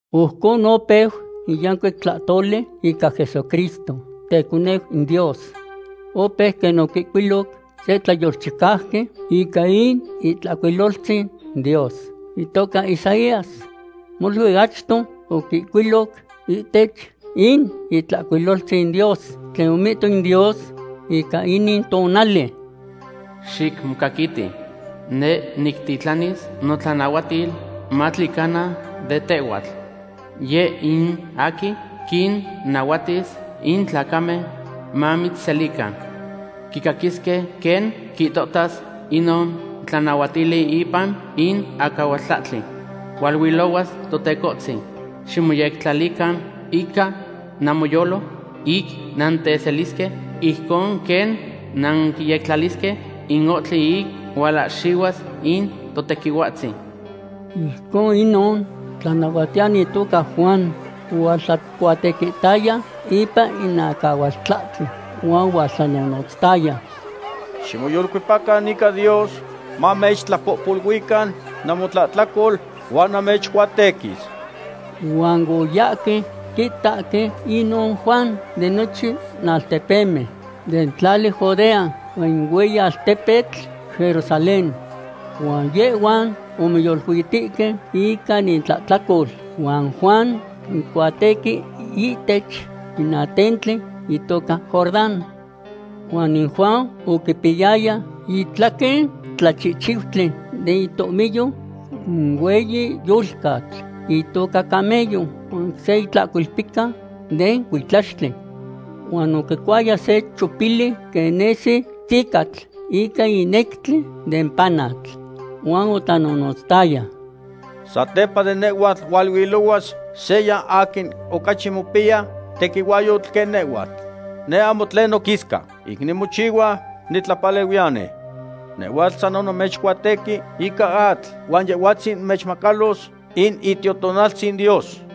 Ojcon opeu in yancuic tlahtoli ica Jesucristo, teconeu in Dios. Opeu quen oquihcuiloc se tlayolchicauqui ica in Itlahcuiloltzin Dios itoca Isaías. Molui achto oquihcuiloc ihtech in Itlahcuiloltzin Dios tlen omihto in Dios ica inin tonali: Xicmocaquiti; neh nictitlanis notlanahuatil matlicana de tehhuatl. Yeh in aquin quinnahuatis in tlacamen mamitzselican. Quicaquisque quen quihtohtas inon tlanahuatili ipan in acahualtlahtli: “Hualuilohuas Totecohtzin. Ximoyectlalican ica namoyolo ic nanteselisque, ijcon quen nanquiyectlalisque in ohtli ic hualahxihuas in Totequihuatzin.” Ijcon inon tlanahuatiyani itoca Juan ohualtlacuatequihtaya ipan in acahualtlahtli, huan ohualtlanonotztaya: ―Ximoyolcuepacan ica Dios mamechtlapohpoluican namotlahtlacol huan namechcuatequis. Huan oyahque quitahque inon Juan de nochin altepemen den tlali Judea huan in hueyi altepetl Jerusalén. Huan yehhuan omoyoluitihque ica intlahtlacol huan Juan oquincuatequi ihtech in atentli itoca Jordán. Huan in Juan oquipiyaya itlaquen tlachihchiutli den itohmiyo in hueyi yolcatl itoca camello, huan se itlahcolpica den cuitlaxtli. Huan oquicuaya se chopili quen nesi tzicatl ica in nectli den panatl. Huan otlanonotzayaya: ―Satepa de nehhuatl hualuilohuas seya aquin ocachi mopiya tequihuahyotl quen nehhuatl. Neh ahmo tlen noquisca ic nimochihua nitlapalehuiyani. Nehhuatl san onamechcuatequi ica atl, huan Yehhuatzin mechmacalos in Itiotonaltzin Dios.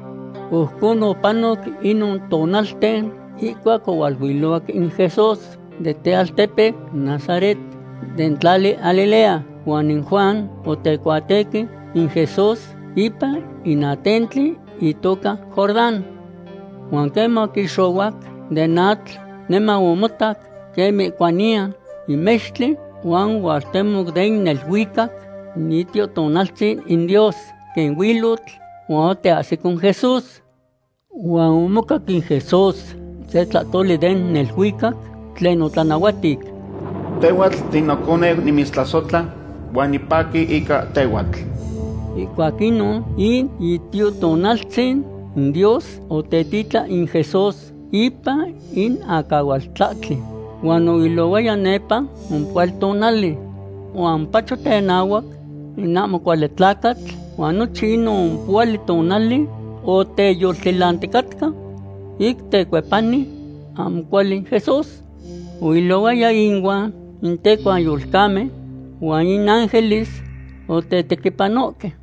Ojcon opanoc inon tonalten, ihcuac ohualuilohuac in Jesús den tealtepeu Nazaret den tlali Galilea, huan in Juan otecuatequi in Jesús ipan in atentli itoca Jordán. Huan queman oquixohuac den atl, niman omotac quen mihcuaniya in mextli huan ohualtemoc den neluicac in Itiotonaltzin in Dios quen huilotl, huan oteahsico in Jesús. Huan omocac in Jesús se tlahtoli den neluicac tlen otlanahuatic: ―Tehhuatl tinoconeu nimitztlasohtla huan nipaqui ica tehhuatl. Ihcuac inon in Itiotonaltzin in Dios otetitlan in Jesús ipan in acahualtlahtli, huan oilohuaya nepa ompohuali tonali. Huan omopacho tenahuac in ahmo cuali tlacatl huan nochin inon ompohuali tonali oteyoltilanticatca ic tecuepani ahmo cuali in Jesús. Oilohuaya ihuan in tecuanyolcamen huan in ángeles otetequipanohque.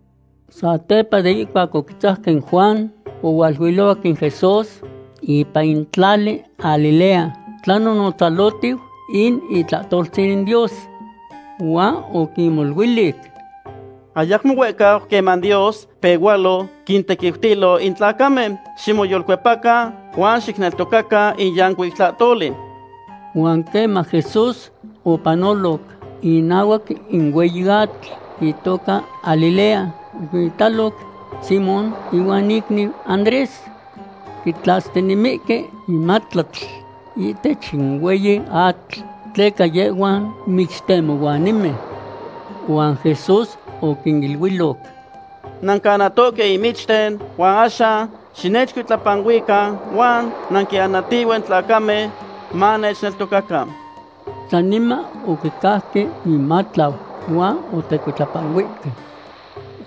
Satepa de ihcuac oquitzajque in Juan, ohualuilohuac in Jesús ipan in tlali Galilea, tlanonotzalohtiu in itlahtoltzin in Dios. Huan oquinmoluilic: ―Ayacmo huehcau queman Dios pehualo quintequiutilo in tlacamen. Ximoyolcuepacan huan xicneltocacan in yancuic tlahtoli. Huan queman Jesús opanoloc inahuac in hueyi atl itoca Galilea, oquinitaloc Simón ihuan icniu Andrés. Quitlastinemihque in matlatl ihtech in hueyi atl, tleca yehhuan michtemohuanimen. Huan Jesús oquiniluiloc: ―Nancanahtohque in michten huan axan xinechcuitlapanuican huan nanquinanatihue in tlacamen manechneltocacan. Saniman oquicauque inmatlau huan otecuitlapanuihque.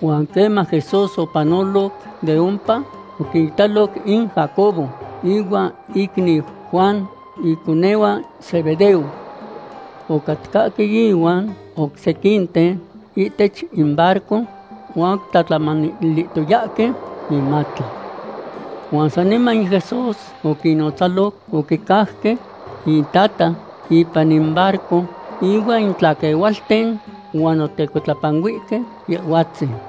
Huan queman Jesús opanoloc de ompa, oquinitaloc in Jacobo ihuan icniu Juan, iconehuan Zebedeo. Ocatcahque ihuan oc sequinten ihtech in barco huan oquitlahtlamanilihtoyahque inmatlau. Huan saniman in Jesús oquinnotzaloc, oquicauque intata ipan in barco ihuan in tlaquehualten, huan otecuitlapanuihque Yehhuatzin.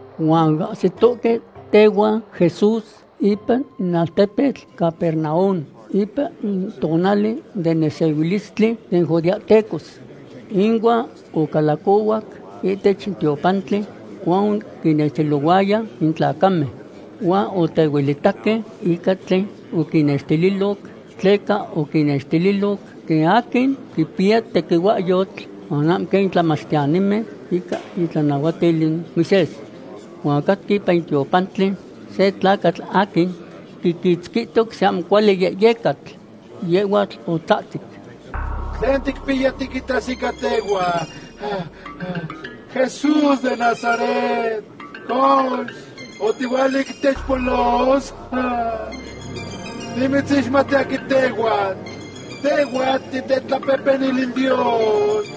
Huan oahsitohque tehuan Jesús ipan in altepetl Capernaum ipan in tonali den nesehuilistli den judeahtecos. Inuan ocalacohuac ihtech in tiopantli huan oquinnextililohuaya in tlacamen. Huan otehuelitaque ica tlen oquinnextililoc, tleca oquinnextililoc quen aquin quipiya tequihuahyotl huan ahmo quen in tlamachtiyanimen ica itlanahuatil in Moisés. Huan ocatca ipan in tiopantli se tlacatl aquin quiquitzquihtoc se ahmo cuali yehyecatl. Yehhuatl otzahtzic: ―¿Tlen ticpiya tiquitas ica tehhuan, Jesús de Nazaret? Cox, ¿otihuala ic titechpolos? Nimitzixmati aquin tehhuatl. Tehhuatl titetlapehpenil in Dios.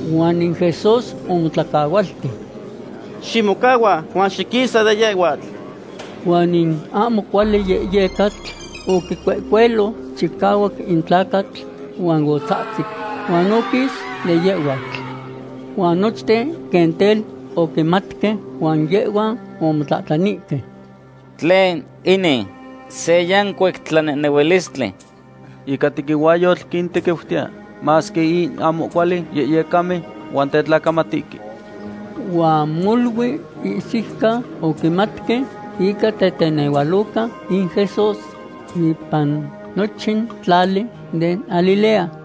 Huan in Jesús omotlacahualti: ―¡Ximocahua huan xiquisa de yehhuatl! Huan in ahmo cuali yehyecatl oquicuehcuelo chicahuac in tlacatl, huan otzahtzic huan oquis de yehhuatl. Huan nochten quen tel oquimatque huan ic yehhuan omotlahtlanihque: ―¿Tlen inin? ¡Se yancuic tlanehnehuilistli! Ica tequihuahyotl quintequiutiya masque in ahmo cuali yehyecamen huan tetlacamatihque. Huan molui ihsiucan oquimatque ica tetenehualoca in Jesús ipan nochin tlali den Galilea.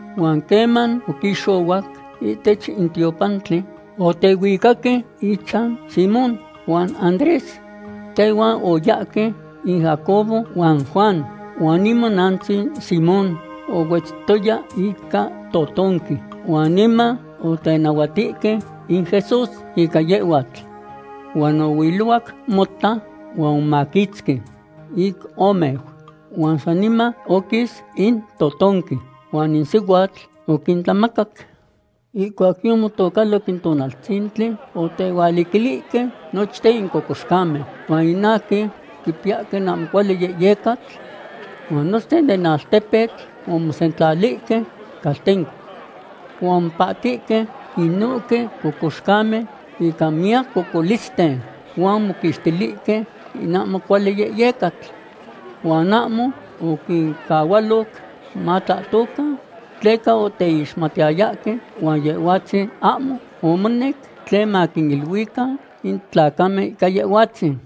Huan queman oquixohuac ihtech in tiopantli, otehuicaque ichan Simón huan Andrés. Tehuan oyahque in Jacobo huan Juan. Huan imonantzin Simón ohuetztoya ica totonqui huan niman otenahuatihque in Jesús ica yehhuatl. Huan ohuilohuac mota huan omomaquitzqui ic omeu, huan saniman oquis in totonqui huan in sihuatl oquintlamacac. Ihcuac yomotocaloc in tonaltzintli, otehualiquilihque nochten in cocoxcamen huan in aquin quipiyahque in ahmo cuali yehyecatl. Huan nochten den altepetl omosentlalihque caltenco. Huan omopahtihque inohque cocoxcamen ica miyac cocolisten, huan omoquixtilihque in ahmo cuali yehyecatl. Huan ahmo oquincahualoc matlahtocan, tleca oteixmatiyayahque huan Yehhuatzin ahmo omonec tlen maquiniluican in tlacamen ica Yehhuatzin.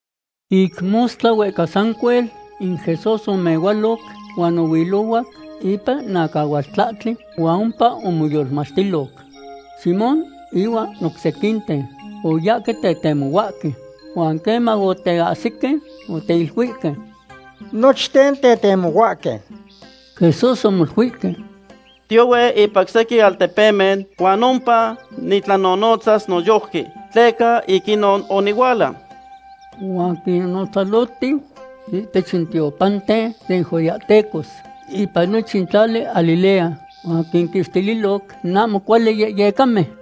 Ic mostla huehca sancuel, in Jesús omehualoc huan ohuilohuac ipan in acahualtlahtli huan ompa omoyolmachtiloc. Simón ihuan oc sequinten oyahque tetemohuahque. Huan queman oteahsique, oteiluihque: ―Nochten tetemohuahque. Jesús omoluihque: ―Tiohue ipan oc sequin altepemen huan ompa nitlanonotzas noyojqui, tleca ic inon onihuala. Huan quinonotzalohtiu ihtech in tiopanten den judeahtecos ipan nochin tlali Galilea, huan quinquixtililo in ahmo cuali yehyecamen.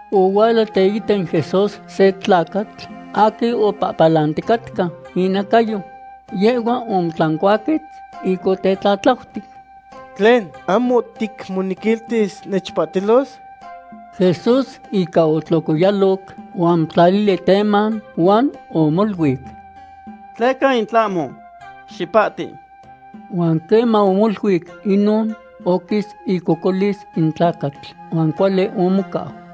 Ohuala teita Jesús se tlacatl aquin opalanticatca inacayo. Yehhua omotlancuaquetz ic otetlatlautic: ―¿Tlen, ahmo ticmonequiltis nechpahtilos? Jesús ica otlocoyaloc huan omotlalili teman, huan omoluic: ―Tleca in tlahmo. Xipahti. Huan queman omoluic inon, oquis icocolis in tlacatl huan cuali omocau.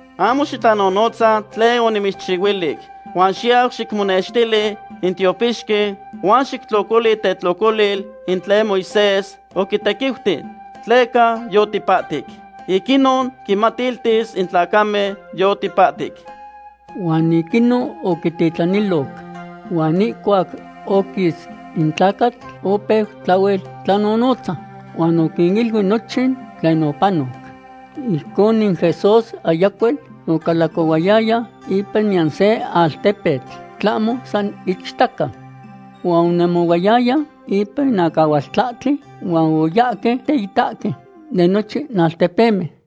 ―Ahmo xitlanonotza tlen onimitzchihuilic, huan xiyau xicmonextili in tiopixqui huan xictlocoli itetlocolil in tlen Moisés oquitequiuti, tleca yotipahtic. Ic inon quimatiltis in tlacamen yotipahtic. Huan ic inon oquititlaniloc. Huan ihcuac oquis in tlacatl, opeu tlahuel tlanonotza, huan oquiniluic nochin tlen opanoc. Ijcon in Jesús ayacuel ocalacohuayaya ipan niyan se altepetl tlahmo san ichtaca. Huan onemohuayaya ipan in acahualtlahtli huan oyahque teitahque de nochin altepemen.